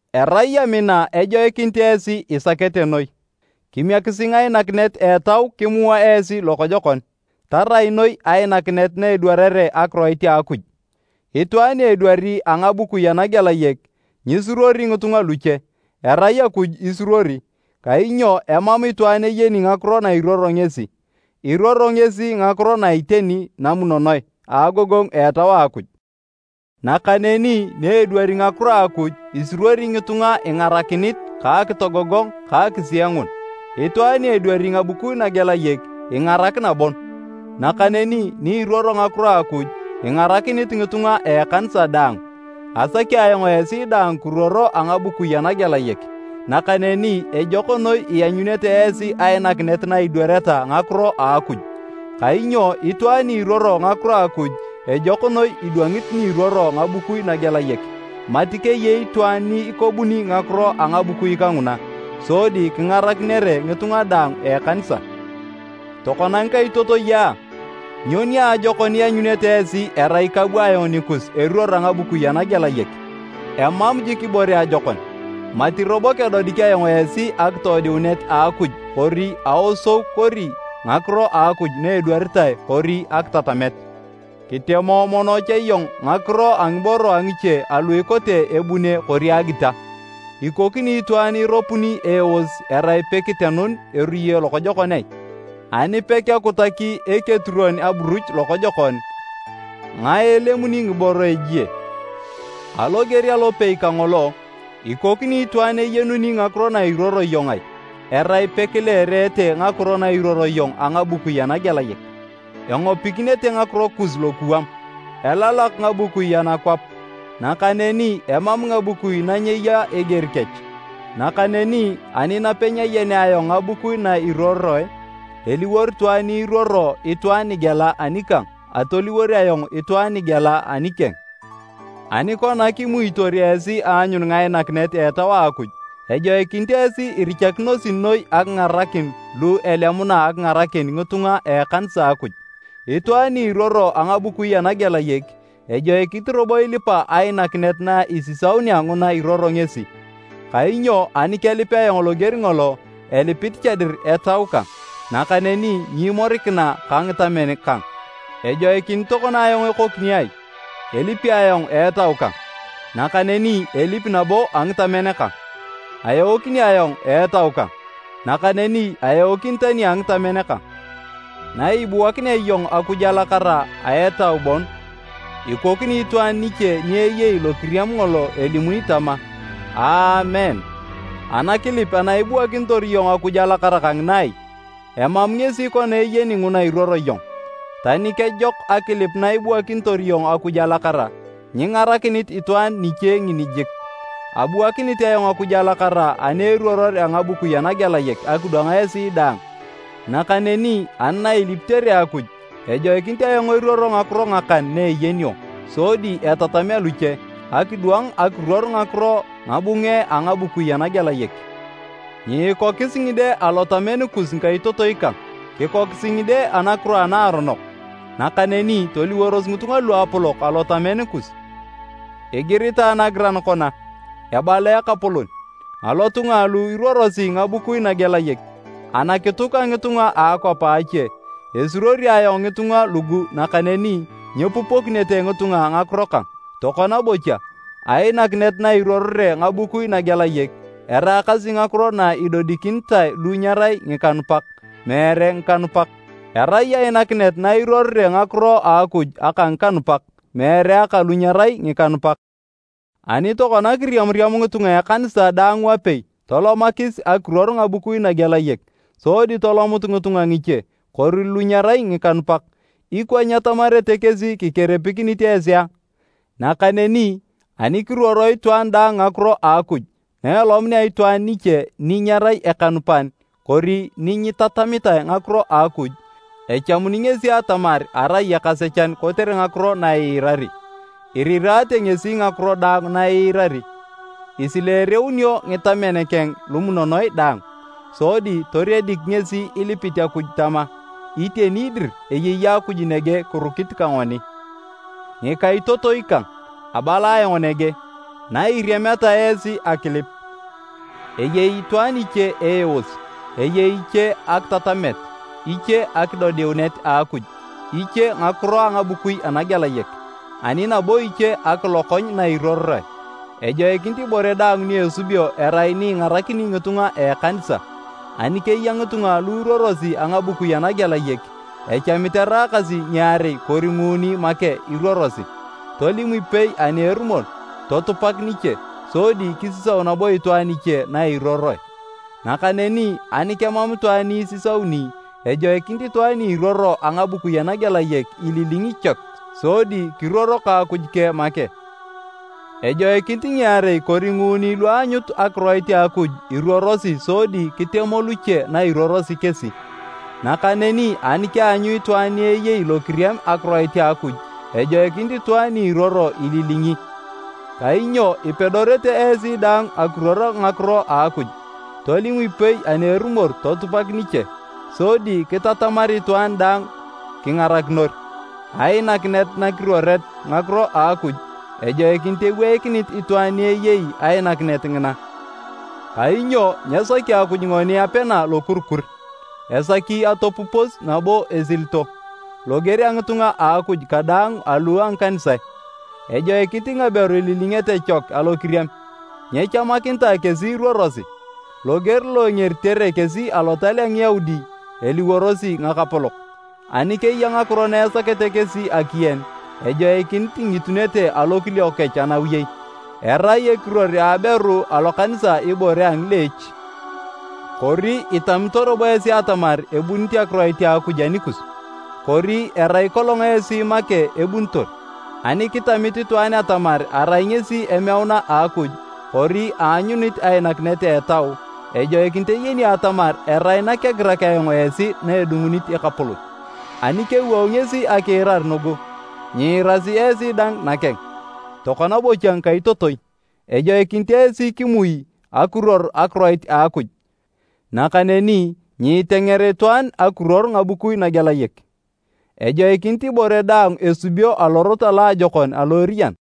Erai amina ejoikinit esi isakete noi. Kimiekisi ngainakinet a Etau kimua esi lokojokon, tarai noi ainakinet na edwarere akiroit a Akuj. Itwaan ni edwari a ngabukui anagelayek, nyisuruori ngitunga luche, erai Akuj isuruori, kainyo emam itwaan eyeni ngakiro nairuoro ngesi. Iruoro ngesi ngakiro na iteni namunonoe, a agogongu a Etau a Akuj. Nakaneni ni edwari ngakiro a Akuj, isuruori ngitunga ingarakinit ka akitogogong ta akisiengun. Itwaan ni edwari ngabukui nagelayek, ingarakina bon, nakaneni ni iruoro ngakiro a Akuj, ingarakinit ngitunga a ekanisa daang. Asaki ayong esi daang kiruoro a ngabukui anagelayek, nakaneni ejok noi ianyunete esi ainakinet na idwareta ngakiro a Akuj. Kainyo itwaan ni iruoro ngakiro a Akuj, ejok noi idwangit ni iruoro ngabukui nagelayek, mati keyei itwaan ni ikobuni ngakiro a ngabukui kanguna, sodi kingarakinere ngitunga daang a ekanisa. Tokona ngikaitotoi a, nyo niajokon ianyunete esi erai kabu ayong nikus eruor a ngabukui anagelayek? Emam jik ibore ajokon, mati robo kedodik ayong esi akidodiunet a Akuj kori aosou kori ngakiro a Akuj na edwaritae kori akitatamet. Kitemo mono cha iyong ngakiro a ngiboro a ngiche alu ikote ebune kori agita, ikokini itwaan iropori eeos erai pekitenun eruye lokojokon ai? Ani pekekutaki eketuruon aburuch lokojokon, ngae elemuni ngiboro a ejie? Aloger alopei kangolo, ikokini itwaan eyenuni ngakiro na iruoro iyong ai, erai pekileerete ngakiro nairuoro iyong a ngabukui anagelayek? Engopikinete ngakiro kus lokuwam! Elalak ngabukui anakwap, nakaneni emam ngabukui na nyeya eger kech. Nakaneni ani napenyayenea ayong ngabukui na iruoroe, eliwor itwaan ni iruoro itwaan nigela anikang atoliwor ayong itwaan nigela anikeng. Ani kona kimuitor esi aanyun ngainakinet a Etau a Akuj, ejoikinit esi irichakinosi noi akingarakin lu elemuna akingarakin ngitunga a ekanisa a Akuj. Itwaan ni iruoro a ngabukui anagelayek, ejoikinit robo ilipa ainakinet na isisaunea nguna iruoro ngesi. Kainyo ani kelip ayong loger ngolo, ilipit cha dir etau kang, nakaneni nyimorikina ka ngitamen kang. Ejoikinit tokona ayong ekokini ai? Elipi ayong a etau kang, nakaneni elipi nabo a ngitamen kang. Aeokini ayong a etau kang, nakaneni aeokini tani a ngitamen kang. Naibuakinea iyong Akuj alakara a etau bon, ikokini itwaan niche ni eyei lokiriam ngolo elimuni tama, “Aamen” anakilip ana ibuakinitor iyong Akuj alakara kangina ai? Emam ngesi kona eyeni nguna iruoro iyong. Tani kejok akilip na ibuakinitor iyong Akuj alakara, nyingarakinit itwaan niche ngini jik. Abuakinit ayong Akuj alakara ani eruoror a ngabukui anagelayek akidwang esi daang. Nakaneni ani nailipitere Akuj, ejoikinit ayong eruoro ngakiro ngakan na eyenio, sodi etatamea luche, akidwang akiruor ngakiro ngabunge a ngabukui anagelayek. Nyiikokis ngide alotamen kus ngikaitotoi kang. Kikokisi ngide anakiro anaaronok, nakaneni toliworos ngitunga luapolok alotamen kus. Igiritae nagiran kona, “Ebala Ekapolon, alotunga alu iruorosi ngabukui nagelayek, anakituk a ngitunga a akwap a ache, esuruori ayong ngitunga lugu nakaneni nyepupokinete ngitunga ngakiro kang.” Tokona bocha, ainakinet na iruorore ngabukui nagelayek, eraakasi ngakiro na idodikinitae lu nyerai ngikanupak, meere ngikanupak. Erai ainakinet na iruorore ngakiro a Akuj aka ngikanupak, meere aka lu nyerai ngikanupak. Ani tokona kiriamariam ngitunga a ekanisa daang wapei tolomakis akiruor ngabukui nagelayek, sodi tolomut ngitunga ngiche, kori lu nyerai ngikanupak, ikwa nyetamarete kesi kikeripikinit esi a? Nakaneni ani kiruoro itwaan daang ngakiro a Akuj na elomunea itwaan iche ni nyerai ekanupan kori ni nyitatamitae ngakiro a Akuj, echamuni ngesi atamar arai ekasechan kotere ngakiro na iirari. Iriraate ngesi ngakiro daang na iirari, isileereunio ngitamen keng lumunonoe daang, sodi toriedik ngesi ilipit Akuj tama, “Iteni dir eyei Akuj nege kirukit ka ngoni!” Ngikaitotoi kang, abala ayong nege. Nairiameta esi akilip, eyei itwaan iche eeos, eyei iche akitatamet, iche akidodiunet a Akuj, iche ngakiro a ngabukui anagelayek, ani nabo iche akilokony na iruoroe. Ejoikinit ibore daang ni esubio erai ni ingarakini ngitunga a ekanisa. Ani keya ngitunga lu iruorosi a ngabukui anagelayek, echamit eraakasi ngiarei kori nguuni make iruorosi, tolim ipei ani erumor totupak niche, sodi kisisau nabo itwaan iche nairuoroe. Nakaneni ani kemam itwaan ni isisauni, ejoikinit itwaan ni iruoro a ngabukui anagelayek ililingi chek sodi kiruoro ka Akuj keng make. Ejoikinit ngiarei kori nguuni lu aanyut akiroit a Akuj iruorosi sodi kitemo luche na iruorosi kesi. Nakaneni ani keanyu itwaan ni eyei lokiriam akiroit a Akuj, ejoikinit itwaan ni iruoro ililingi. Kainyo ipedorete esi daang akiruor ngakiro a Akuj, tolim ipei ani erumor totupak niche, sodi kitatamar itwaan daang kingarakinor. Ainakinet nakiruoret ngakiro a Akuj, ejoikinit eweikinit itwaan ni eyei ainakinet ngina, kainyo nyesaki Akuj ngoni apena lokurikur, esaki atopupos nabo esilito. Loger a ngitunga a Akuj kadaang alu a ngikanisae, ejoikinit ngaberu ililingete chek alokiriam. Nyechamakinitae kesi iruorosi, loger lo engeritere kesi Alotal a Ngiyaudi eliworosi ngakapolok. Ani keya ngakiro na esakete kesi akiyen, ejoikinit ingitunete alokiliok kech anawiyei. Erai ekiruor a aberu alokanisa ibore a ngileech. Kori itamito robo esi atamar ebunit akiroit a Akuj anikus? Kori erai kolong esi make ebunitor? Ani kitamit itwaan atamar arai ngesi emeuna a Akuj kori aanyunit ainakinet a Etau, ejoikinit eyeni atamar erai nakegirak ayong esi na edungunit Ekapolon. Ani kewou ngesi akiirar nugu, nyiirasi esi dang nakeng. Tokona bocha ngikaitotoi, ejoikinit esi kimui akiruor akiroit a Akuj, nakaneni nyiitenger itwaan akiruor ngabukui nagelayek. Ejoikinit ibore daang esubio alorot aloajokon alo eriyan.